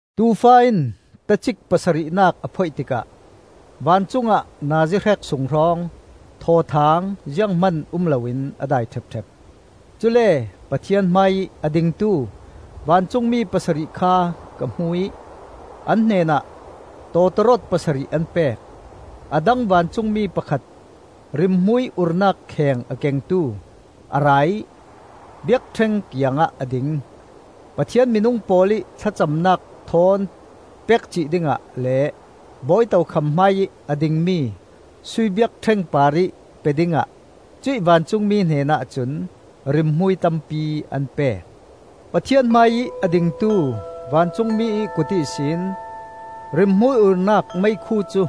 Tuufa in tacik pasarihnak a phoih tikah vancungah nazi hrek sung hrawng thawthaang zianghman um loin a dai ṭhepṭhep. Cule Pathian hmaiih a dingtu vancungmi pasarih kha ka hmu ih an hnenah tawtawrawt pasarih an pek. A dang vancungmi pakhat, rimhmui urnak kheng a kengtu, a ra ih biakṭheng kiangah a ding. Pathian minung pawl ih thlacamnak thawn pek cih dingah le bawi tokham hmaiih a dingmi sui biakṭheng parih pe dingah cuih vancungmi hnenah cun rimhmui tampi an pek. Pathian hmaiih a dingtu vancungmi ih kut ihsin rimhmui urnak meikhu cu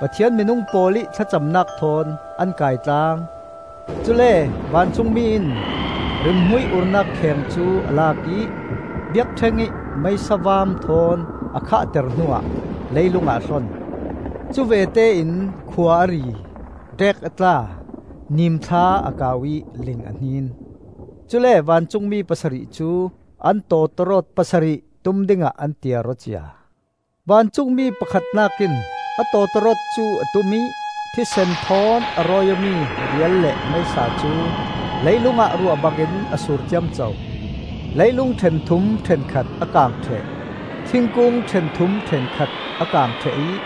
Pathian minung pawl ih thlacamnak thawn an kai tlaang. Cule vancungmi in rimhmui urnak kheng cu a lak ih biakṭheng ih meisa vaam thawn a khahter hnuah leilungah a hlon. Cuvete in khua a ri, ṭeek a tla, nimthla a kau ih ling a hnin. Cule vancungmi pasarih cu an tawtawrawt pasarih tum dingah an tiar aw cia. Vancungmi pakhatnak in a tawtawrawt cu a tum ih thisen thawn a rawi awmi rial le meisa cu leilung ah ruah bangin a sur ciamco. Leilung ṭhenthum ṭhenkhat a kang ṭheh, thingkung ṭhenthum ṭhenkhat a kang ṭheh ih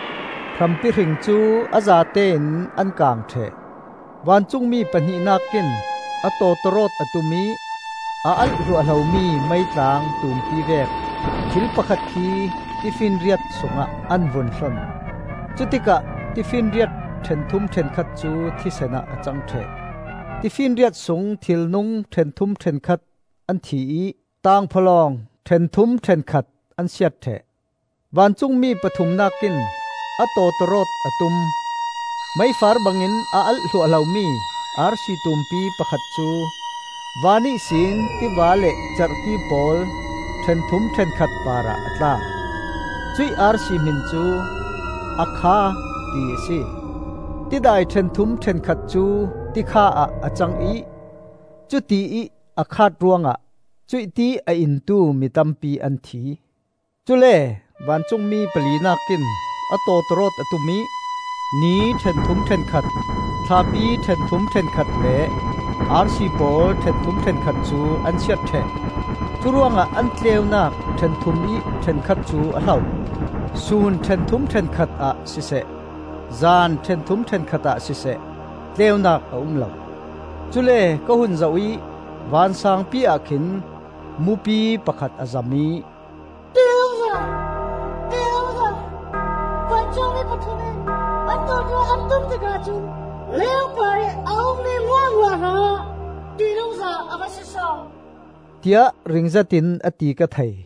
hrampi hring cu a zatein an kang ṭheh. Vancungmi pahnihnak in a tawtawrawt a tum ih a alh hluahhlomi meitlang tumpi vek thil pakhat khi tifinriat sungah an vun hlon. Cutikah tifinriat ṭhenthum ṭhenkhat cu thisen ah a cang ṭheh. Tifinriat sung thilnung ṭhenthum ṭhenkhat an thi ih tangphawlawng ṭhenthum ṭhenkhat an siat ṭheh. Vancungmi pathumnak in a tawtawrawt a tum. Meifar bangin a alh hluahhlomi arsi tumpi pakhat cu van ihsin tiva le cerhti pawl ṭhenthum ṭhenkhat parah a tla. Cuih arsi hmin cu, “A Kha,” ti a si. Tidai ṭhenthum ṭhenkhat cu tikha ah a cang ih cutiih a khaat ruangah cuih ti a intu mi tampi an thi. Cule vancungmi palinak in a tawtawrawt a tum ih ni ṭhenthum ṭhenkhat, thlapi ṭhenthum ṭhenkhat le arsi pawl ṭhenthum ṭhenkhat cu an siat ṭheh. Curuangah an tleunak ṭhenthum ih ṭhenkhat cu a hlo. Sun ṭhenthum ṭhenkhat ah siseh, zan ṭhenthum ṭhenkhat ah siseh, tleunak a um lo. Cule ka hun zoh ih vansangpi-ah khin mupi pakhat a zam ih, “Ṭihnungza! Ṭihnungza! Vancungmi pathum in an tawtawrawt an tum tikah cun leilung parih a ummi hmuahhmuah hrangah ṭihnungza a va si so!” tiah ring zetin a ti ka thei.